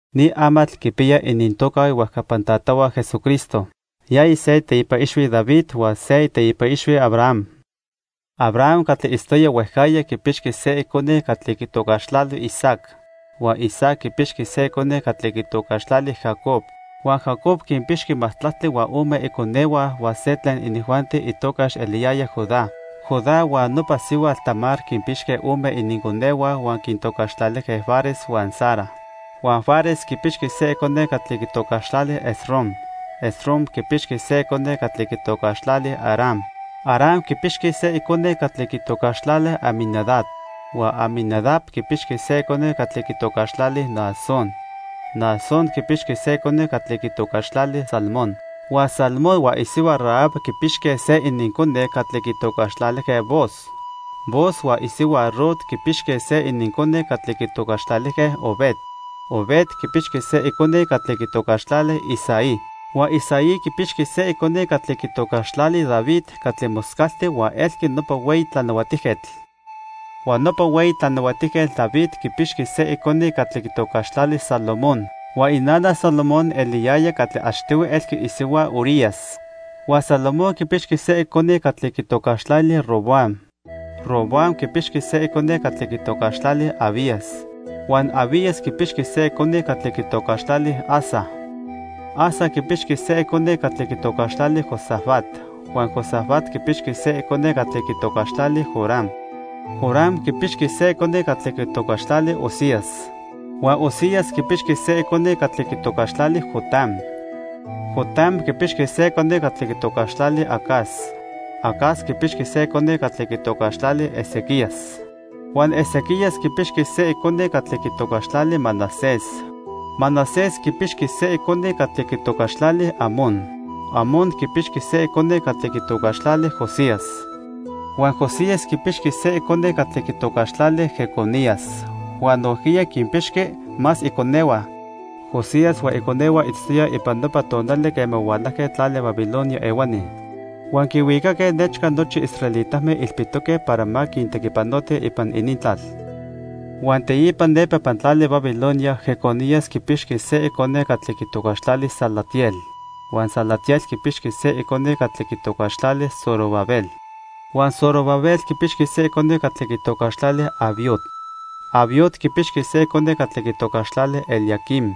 Ni amatl quipiya inintoca ihuejcapan tatahua Jesucristo. Yaya se iteipa ixhui David huan se iteipa ixhui Abraham. Abraham catli itztoya huejcajya quipixqui se icone catli quitocaxtlali Isaac. Huan Isaac quipixqui se icone catli quitocaxtlali Jacob. Huan Jacob quinpixqui majtlactli huan ome iconehua huan se tlen inijuanti itocax eliyaya Judá. Judá huan nopa sihuatl Tamar quinpixque ome ininconehua huan quintocaxtlalijque Fares huan Zara. Huan Fares quipixqui se icone catli quitocaxtlali Esrom. Esrom quipixqui se icone catli quitocaxtlali Aram. Aram quipixqui se icone catli quitocaxtlali Aminadab. Huan Aminadab quipixqui se icone catli quitocaxtlali Naasón. Naasón quipixqui se icone catli quitocaxtlali Salmón. Huan Salmón huan isihua Rahab quipixque se inincone catli quitocaxtlalijque Booz. Booz huan isihua Rut quipixque se inincone catli quitocaxtlalijque Obed. Obed quipixqui se icone catli quitocaxtlali Isaí. Huan Isaí quipixqui se icone catli quitocaxtlali David catli moscalti huan elqui nopa hueyi tlanahuatijquetl. Huan nopa hueyi tlanahuatijquetl David quipixqui se icone catli quitocaxtlali Salomón. Huan inana Salomón eliyaya catli achtihui elqui isihua Urías. Huan Salomón quipixqui se icone catli quitocaxtlali Roboam. Roboam quipixqui se icone catli quitocaxtlali Abías. Huan Abías quipixqui se icone catli quitocaxtlali Asa. Asa quipixqui se icone catli quitocaxtlali Josafat. Huan Josafat quipixqui se icone catli quitocaxtlali Joram. Joram quipixqui se icone catli quitocaxtlali Uzías. Huan Uzías quipixqui se icone catli quitocaxtlali Jotam. Jotam quipixqui se icone catli quitocaxtlali Acaz. Acaz quipixqui se icone catli quitocaxtlali Ezequías. Huan Ezequías quipixqui se icone catli quitocaxtlali Manasés. Manasés quipixqui se icone catli quitocaxtlali Amón. Amón quipixqui se icone catli quitocaxtlali Josías. Huan Josías quipixqui se icone catli quitocaxtlali Jeconías huan nojquiya quinpixqui más iconehua. Josías huan iconehua itztoyaj ipan nopa tonali quema hualajque tlali Babilonia ehuani huan quinhuicaque nechca nochi israelitame ilpitoque para ma quintequipanotij ipan inintlal. Huan teipa nepa ipan tlali Babilonia Jeconías quipixqui se icone catli quitocaxtlali Salatiel. Huan Salatiel quipixqui se icone catli quitocaxtlali Zorobabel. Huan Zorobabel quipixqui se icone catli quitocaxtlali Abiud. Abiud quipixqui se icone catli quitocaxtlali Eliaquim.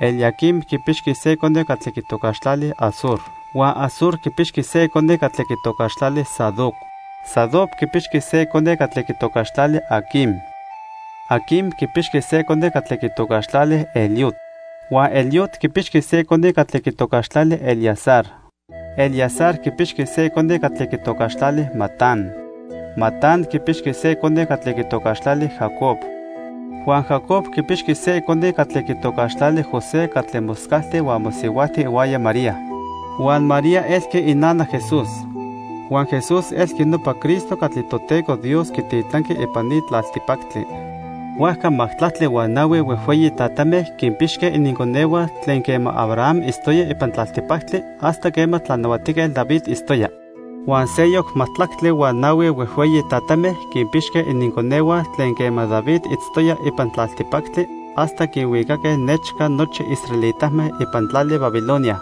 Eliaquim quipixqui se icone catli quitocaxtlali Azor. Huan Azor quipixqui se icone catli quitocaxtlali Sadoc. Sadoc quipixqui se icone catli quitocaxtlali Aquim. Aquim quipixqui se icone catli quitocaxtlali Eliud. Huan Eliud quipixqui se icone catli quitocaxtlali Eleazar. Eleazar quipixqui se icone catli quitocaxtlali Matán. Matán quipixqui se icone catli quitocaxtlali Jacob. Huan Jacob quipixqui se icone catli quitocaxtlali José catli moscalti huan mosihuajti ihuaya María. Huan María elqui inana Jesús. Huan Jesús elqui nopa Cristo catli Toteco Dios quititlanqui ipan ni tlaltipactli. Huajca majtlactli huan nahui huejhueyi tatame quinpixque ininconehua tlen quema Abraham itztoya ipan tlaltipactli hasta quema Tlanahuatijquetl David itztoya. Huan seyoc majtlactli huan nahui huejhueyi tatame quinpixque ininconehua tlen quema David itztoya ipan tlaltipactli hasta quinhuicaque nechca nochi israelitame ipan tlali Babilonia.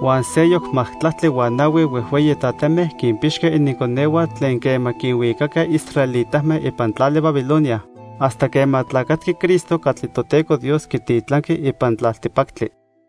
Huan seyoc majtlactli huan nahui huejhueyi tatame quinpixque ininconehua tlen quema quinhuicaque israelitame ipan tlali Babilonia hasta quema tlacatqui Cristo catli Toteco Dios quititlanqui ipan tlaltipactli.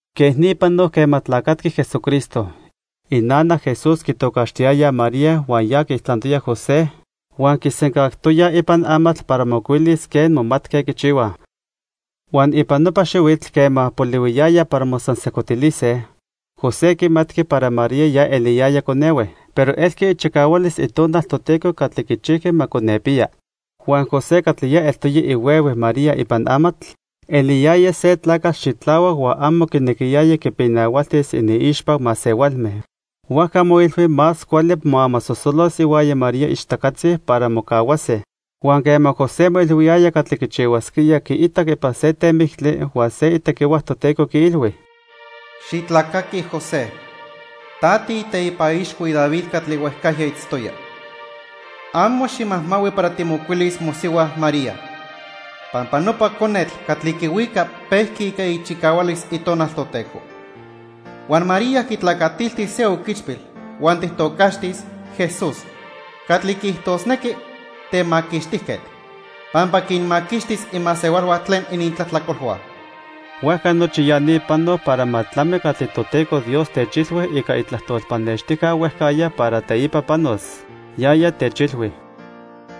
Quej ni panoc quema tlacatqui Jesucristo. Inana Jesús quitocaxtiyayaj María huan ya quiijtlantoya José huan quisencajtoyaj ipan amatl para mocuilis quen momatque quichihuaj. Huan ipan nopa xihuitl quema polihuiyaya para mosansejcotilise, José quimatqui para María ya eliyaya conehue, pero elqui ichicahualis Itonal Toteco catli quichijqui ma conepiya. Huan José, catli ya eltoya ihuehue María ipan amatl, eliyaya se tlacatl xitlahuac huan amo quinequiyaya quipinahualtis iniixpa masehualme. Huajca moilhui más cuali moamasosolos ihuaya María ichtacatzi para mocahuase. Huan quema José moilhuiyaya catli quichihuasquía, quiitac ipan se temictli huan se itequihua Toteco quiilhui: "Xitlacaqui José, ta tiiteipa ixhui David catli huejcajya itztoya. Amo ximajmahui para timocuilis mosihua María, pampa nopa conetl catli quihuica pejqui ica ichicahualis Itonal Toteco. Huan María quitlacatiltis se oquichpil huan tijtocaxtis: 'Jesús' catli quiijtosnequi: 'Temaquixtijquetl'. Pampa quinmaquixtis imasehualhua tlen inintlajtlacolhua." Huajca nochi ya ni panoc para ma tlami catli Toteco Dios techilhui ica itlajtol pannextijca huejcajya para teipa panos. Yaya techilhui: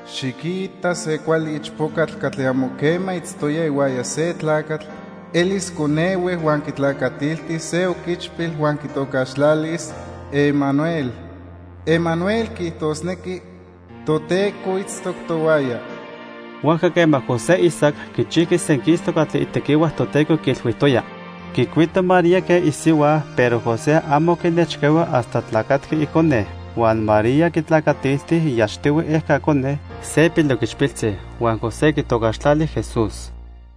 "Xiquita se cuali ichpocatl catli amo quema itztoya ihuaya se tlacatl elis conehue, huan quitlacatiltis se oquichpil huan quitocaxtlalis: Emanuel. Emanuel quiijtosnequi: 'Toteco itztoc tohuaya.' " Huajca quema José isac, quichijqui senquistoc catli itequihua Toteco quiilhuijtoya. Quicuito María quen isihua, pero José amo quinechcahui hasta tlacatqui icone. Huan María quitlacatilti iachtihui ejca cone, se piloquichpiltzi. Huan José quitocaxtlali Jesús.